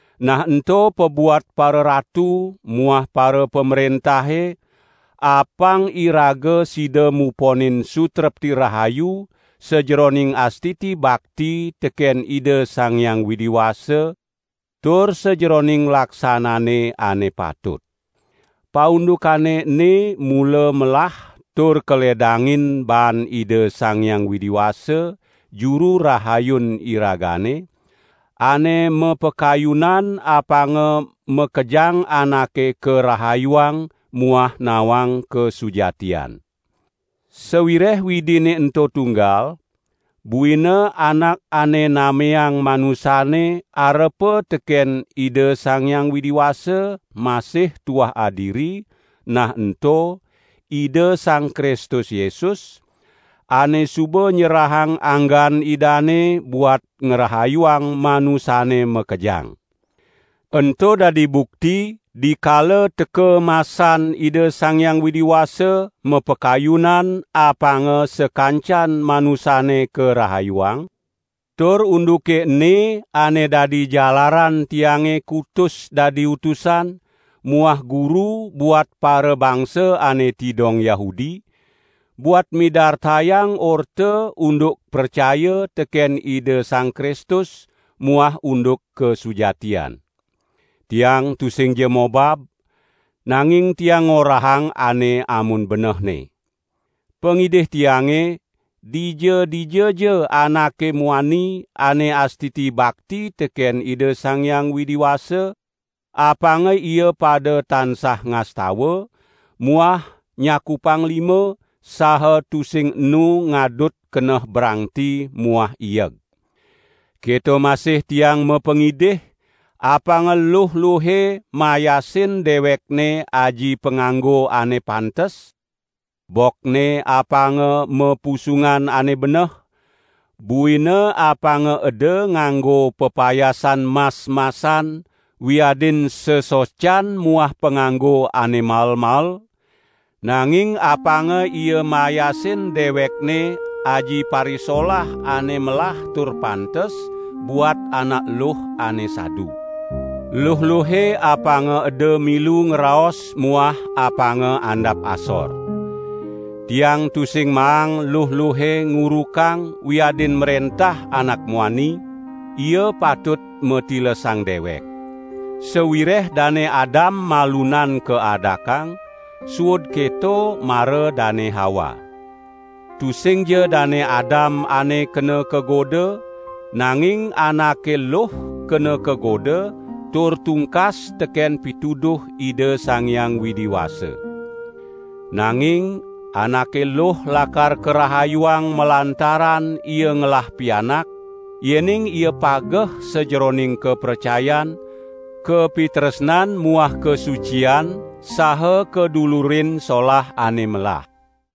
nah ento pabuat pararatu muah parapamrentahe apang iraga sida muponin sutrepti rahayu sajeroning astiti bakti teken Ida Sang Hyang Widi Wasa tur sajeroning laksanane ane patut. Paundukane ene mula melah tur kaledangin baan Ida Sang Hyang Widi Wasa, Juru Rahayun iragane, ane mapakayunan apanga makejang anake karahayuang muah nawang kasujatian. Sawireh Widine ento tunggal, buina Anak ane nameang manusane arepa teken Ida Sang Hyang Widi Wasa masih tuah adiri, nah ento: Ida Sang Kristus Yesus, ane suba nyerahang anggan Idane buat ngrahayuang manusane makejang. Ento dadi bukti, dikala teka masan Ida Sang Hyang Widi Wasa mapakayunan apanga sakancan manusane karahayuang, tur unduke ene ane dadi jalaran tiange kutus dadi utusan muah guru buat parabangsa ane tidong Yahudi, buat midartayang orta unduk pracaya teken Ida Sang Kristus muah unduk kasujatian. Tiang tusingja mobab, nanging tiang ngorahang ane amun benehne! Pangidih tiange, dija-dijaja anake muani ane astiti bakti teken Ida Sang Hyang Widi Wasa, apanga ia pada tansah ngastawa, muah nyakupang lima, saha tusing enu ngadut keneh brangti muah ieg. Keto masih tiang mapangidih, apanga luh-luhe mayasin dewekne aji panganggo ane pantes; bokne apanga mapusungan ane beneh, buina apanga eda nganggo pepayasan mas-masan wiadin sesocan muah panganggo ane mael-mael, nanging apanga ia mayasin dewekne aji parisolah ane melah tur pantes buat anak luh ane sadu. Luh-luhe apanga eda milu ngraos muah apanga andap asor. Tiang tusing maang luh-luhe ngurukang wiadin mrentah anak muani, ia patut matilesang dewek. Sawireh Dane Adam malunan kaadakang, suud keto mara Dane Hawa. Tusingja Dane Adam ane kena kagoda, nanging anake luh kena kagoda tur tungkas teken pituduh Ida Sang Hyang Widi Wasa. Nanging anake luh lakar karahayuang malantaran ia ngelah pianak, yening ia pageh sajeroning kapracayan, kapitresnan muah kasucian saha kadulurin solah ane melah.